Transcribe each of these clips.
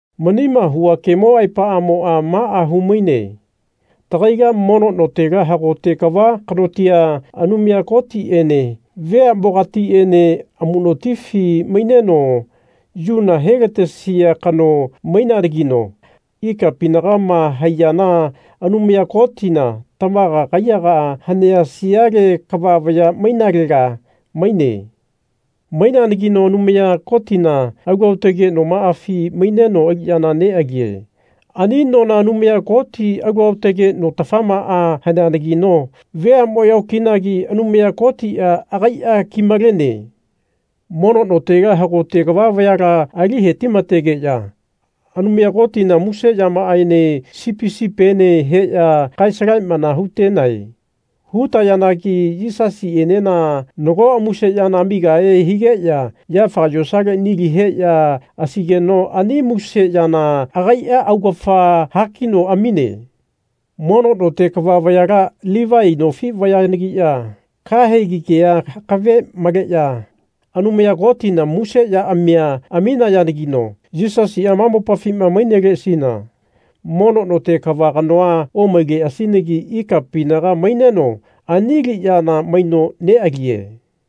Manima hua kemo aepamoa maa humaine tagaila mono notela hagote kava kanotia, Anumaya Kotiene veamogatiene amunotifi maineno yuna helatesia kano maineanagino ikapinagama haiyana Anumaya Kotina tamaga kaiyagaa hanea siale kava vaya mainalaga maine. Maineanagino Anumaya Kotina alu aotage nomaafi maineno aliyana nealie. Ani nona Anumaya Koti alu aotage notafamaa haneanagino veamoya okinagi Anumaya Kotia agaia kimalene. Mono notela hagote kava vayala ali hetimatageya Anumaya Kotina muse yamaaene sipi sipiene heya kae-salamana hutenae. Hutayanagi Yisasienena nago muse yana amigahe higeya yafaga yosale nili heya asaigeno ani muse yana agaia augafa hakino amine. Mono note kava vayala Livai nofi vayalagiya kahegi kea akave maleya Anumaya Kotina muse yaamia aminayanagino Yisasia ma mopafi maineleasina mono note kava kanoa omaileasinagi ikapinaga maineno ani aliyana maino nealie.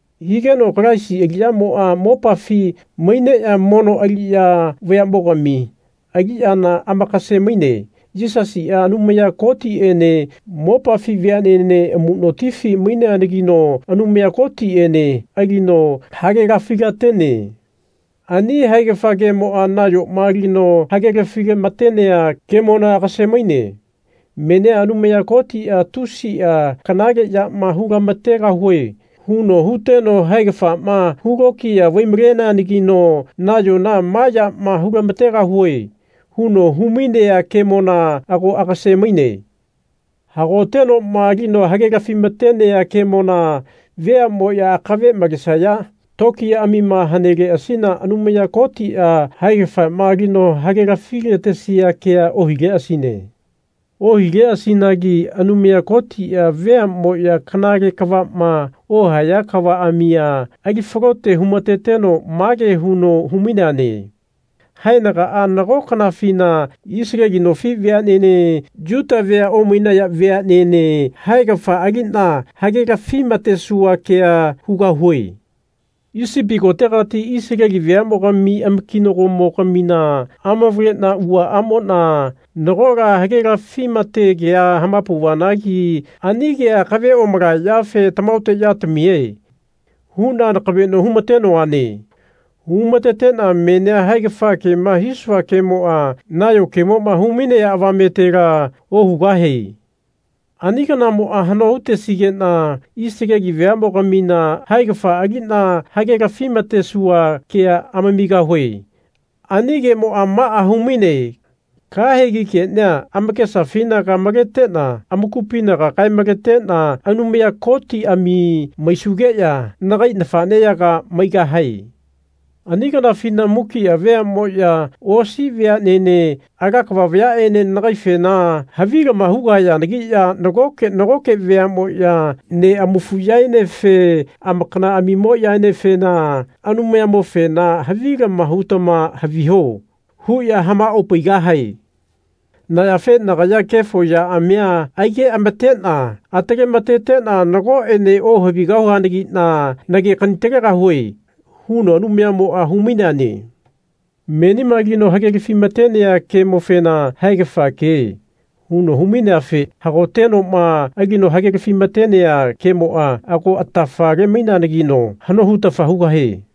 Higeno Kalaisia aliyamoa mopafi maineya mono aliya vayamogami aliyana amakase-maine. Yisasia Anumaya Kotiene mopafi veanene amunotifi maineanagino Anumaya Kotiene alino hagelafi-latene. Ani haegafa kemoa nayoma alino hagelafi-matenea kemona agase-maine. Menia Anumaya Kotia Tusia kanale yama hulamategahue. huno huteno haegafama hulokiya vai-maleneanagino nayona Ma yama hulamategahue. huno humainea kemona ago agase-maine. Hagotenoma alino hagelafi-matenea kemona veamoya akave malesaya tokiyaamima haneleasina Anumaya Kotia haegafama alino hagelafi-latesia kea ohileasine. Ohileasinagi Anumaya Kotia veamoya kanale kavama ohaya kavaamia ali falote humateno mage huno hu-maineane Haenagaa nago kanafina Isaleli nofi veanene Yuta vea omainaya veanene haegafa alina hagelafi-matesua kea hugahue. Isipi kotegati Isaleli veamogami amakinagomo-gamina amavalena uaamona nagola hagelafi-mate kea hamapauvanagi ani kea akave omalaya yafe Tamahaote yatamie. huna nakaveno humatenoane. Humatetena menia haegafa kema hisua kemoa nayo kemoma humainea avametela ohugahie. Ani kanamoa hano hutesigena Isaleli veamogamina haegafa alina hagelafi-matesua kea amamigahue. Ani kemoa maa humaine kahegi kenia amakesafinaga maletena amakupinaga kae-maletena Anumaya Kotiami maisugeya nagai nafaneyaga maigahae. Ani kanafina mukia veamoya osi veanene ala kava vayaene nagaifena havilama hugahayanagiya nagoke nagoke veamoya neamafuyaenefe amakanaamimoyaenefena Anumayamofena havilama hutama haviho. huya hamaopaigahae. Na yafe nagaya kefo yaamia aigeamatena atalematetena nagoene ohavigahuanagina nagekani-talegahue. huno Anumayamoa hu-maineane. Menima alino hagelafi-matenea kemofena Haegafa ke. huno humaineafe hagotenoma alino hagelafi-matenea kemoa ago atafa-lemaineanagino hano hutafa hugahie.